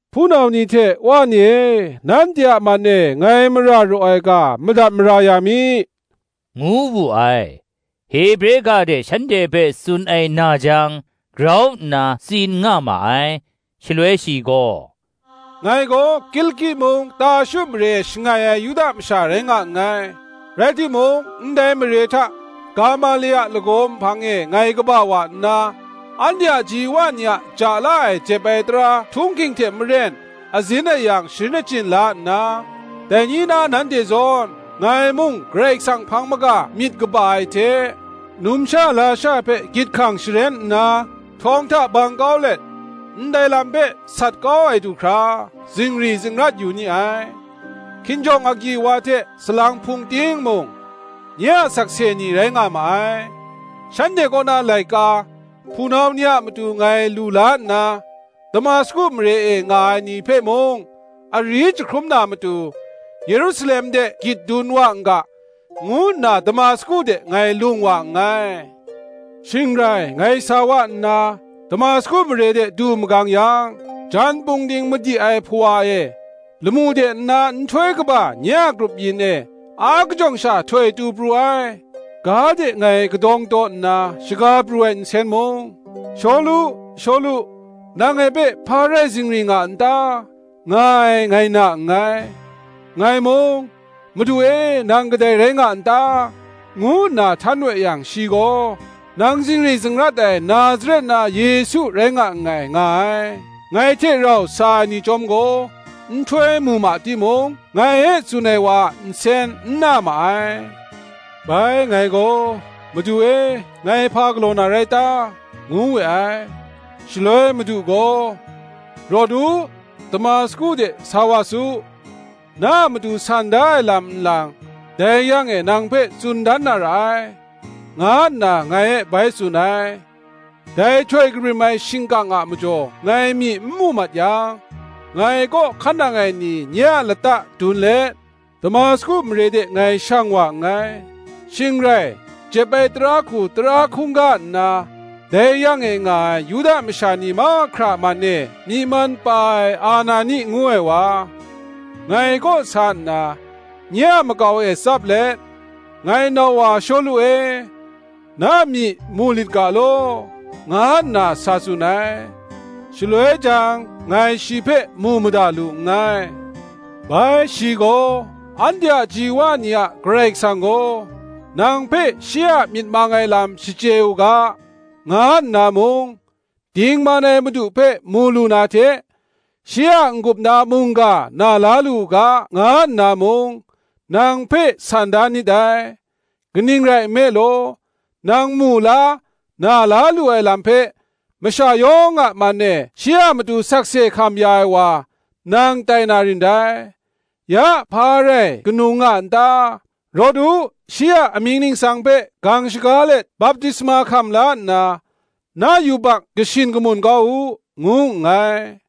“Hpunau ni hte Wa ni e, nanhte a man e ngai mara raw ai ga, madat mara ya mi,” ngu wu ai. Hebre ga hte shanhte hpe tsun ai na jang, grau nna tsin nga ma ai: shaloi shi gaw, “Ngai gaw Kiliki mung, Tarshu mare e shangai ai Yuda masha rai nga nngai; rai timung, ndai mare hta Gamale a lagaw nhpang e ngai kaba wa nna, anhte a ji wa ni a ja la ai jep ai tara htung hking hte maren azin ayang sharin achyin la nna, dai ni na nanhte zawn, ngai mung, Karai Kasang hpang maga myit kaba ai hte, numsha lasha hpe gyit hkang sharen nna, htawng hta bang kau let, ndai lam hpe sat kau ai du hkra, zingri zingrat yu ni ai. Hkinjawng agyi wa hte salang hpung ting mung, nye a sakse ni rai nga ma ai; shanhte kaw na laika, hpunau ni a matu ngai lu la nna, Damasku mare e nga ai ni hpe mung, ari jahkrum na matu, Yerusalem de gyit dun wa n ga, ngu nna Damasku de ngai lung wa nngai. Shing rai ngai sa wa nna, Damasku mare de du magang yang, jan pungding madi ai hpawa e, lamu de nna nhtoi kaba nye a grup yin e akajawng sha htoi tu pru ai. Ga de ngai kadawng taw nna, shaga pru ai nsen mung, ‘Shawlu, Shawlu, nang ngai hpe hpa rai zingri nga n ta?’ nga ai, nga na nngai. Ngai mung, ‘Madu e, nang kadai rai nga n ta?’ ngu nna htan we yang, Shi gaw, ‘Nang zingri zingrat ai Nazaret na Yesu rai nga nngai,’ nga ai. Ngai hte rau sa ai ni chyawm gaw, nhtoi mu ma timung, ngai e tsun ai wa a nsen n na ma ai. Bai ngai gaw, ‘Madu e, ngai hpa galaw na rai ta?’ ngu we ai. Shaloi Madu gaw, ‘Rawt u, Damasku de sa wa su; na a matu san da ai lam nlang, dai yang e nang hpe tsun dan na ra ai,’ nga nna ngai e bai tsun ai. Dai htoi kabrim ai shingkang a majaw ngai myi nmu mat yang, ngai kaw hkan nang ai ni nye a lata dun let, Damasku mare de ngai shang wa nngai. Shing rai, jep ai tara hku tara hkungga nna, dai yang e nga ai Yuda masha ni mahkra man e myi man pa ai Anani ngu ai wa, ngai kaw sa nna, nye a makau e tsap let, ‘Ngai nau wa Shawlu e, na myi mu lit ga law,’ nga nna tsun ai. Shaloi jang ngai shi hpe mu mada lu nngai. Bai shi gaw, ‘Anhte a ji wa ni a Karai Kasang gaw, nang hpe shi a myit mang ai lam shachye u ga, nga nna mung, Dingman ai Madu hpe mu lu na hte shi a n-gup na mungga na la lu u ga, nga nna mung, nang hpe san da nit dai. Kaning rai nme law, nang mu la, na la lu ai lam hpe, masha yawng a man e shi a matu sakse hkam ya ai wa, nang tai na rin dai. Ya hpa rai ganung nga n ta? rawt u, Shi a amying ningsang hpe gang shaga let baptisma hkam la nna, na yubak kashin kamun kau u,’ ngu nngai.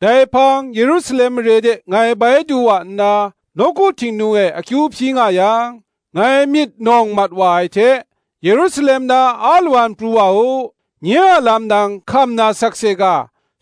Dai hpang Yerusalem mare de ngai bai du wa nna, nawku Htingnu e akyu hpyi nga yang, ngai myit nawng mat wa ai hta, ‘Yerusalem na alawan pru wa u; nye a lam nang hkam na sakse ga,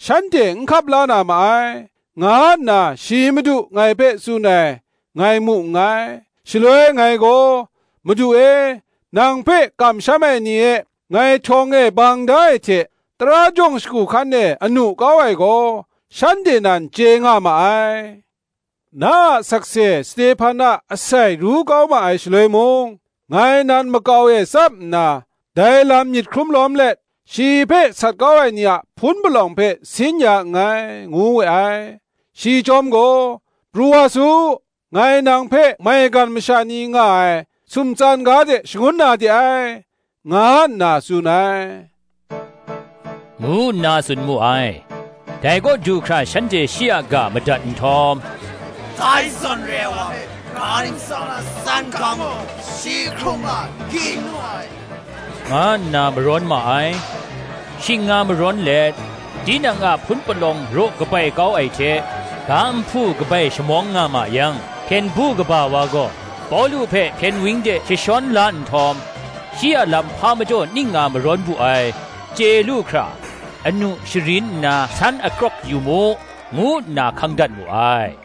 shanhte n hkap la na ma ai,’ nga nna shi Madu ngai hpe tsun ai, ngai mu nngai. Shaloi ngai gaw, ‘Madu e, nang hpe kamsham ai ni e ngai htawng e bang da ai hte tara jawng shagu hkan e anu kau ai gaw, shanhte nan chye nga ma ai: na a sakse Stehpan a asai ru kau ma ai shaloi mung ngai nan makau e tsap nna, dai lam myit hkrum lawm let, shi hpe sat kau ai ni a hpun palawng hpe sin ya nngai,’ ngu we ai. Shi chyawm gaw, ‘Pru wa su; ngai nang hpe maigan masha ni nga ai sumtsan ga de shangun na de ai,’ nga nna tsun ai,” ngu nna tsun mu ai. Dai kaw du hkra shanhte shi a ga madat nhtawm, “Dai zawn re ai wa hpe ga ntsa na tsan kau mu; shi hkrung nga n-ging nu ai,” nga nna marawn ma ai. Shing nga marawn let, tinang a hpun palawng raw kabai kau ai hte, ga nhpu kabai shamawng nga ma yang, hpyen du kaba wa gaw, Pawlu hpe hpyen wang de jashawn la nhtawm, “shi a lam hpa majaw ning nga marawn bu ai, chye lu hkra, anu sharim nna san akrawk yu mu,” ngu nna hkang dat mu ai.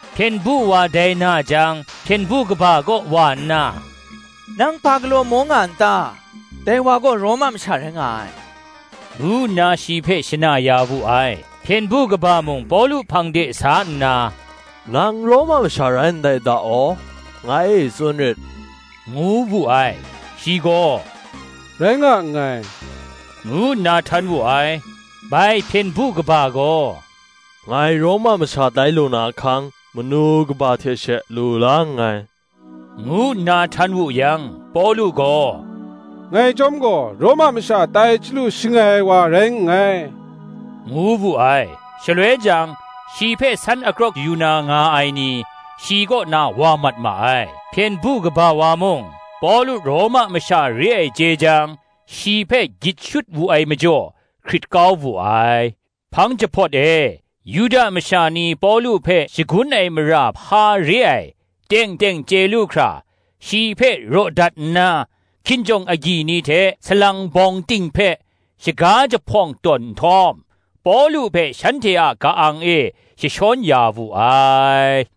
Hpyen du wa dai na jang, hpyen du kaba kaw wa nna, “Nang hpa galaw maw nga n ta? dai wa gaw Roma masha rai nga ai,” ngu nna shi hpe shana ya wu ai. Hpyen du kaba mung Pawlu hpang de sa nna, “Nang Roma masha rai ndai da aw? ngai e tsun rit,” ngu wu ai. Shi gaw, “Rai nga nngai,” ngu nna htan wu ai. Bai hpyen du kaba gaw, “Ngai Roma masha tai lu na ahkang, manu kaba hte she lu la nngai,” ngu nna htan wu yang, Pawlu gaw, “Ngai chyawm gaw, Roma masha tai chyalu shangai ai wa rai nngai,” ngu wu ai. Shaloi jang, shi hpe san akrawk yu na nga ai ni, shi kaw na wa mat ma ai; hpyen du kaba wa mung, Pawlu Roma masha re ai chye jang, shi hpe gyit shut wu ai majaw, hkrit kau wu ai. Hpang jahpawt e, Yuda masha ni Pawlu hpe shagun ai mara hpa re ai, teng teng chye lu hkra, shi hpe raw dat nna, hkinjawng agyi ni hte salang bawng ting hpe shaga jahpawng tawn nhtawm, Pawlu hpe shanhte a ka-ang e jashawn ya wu ai.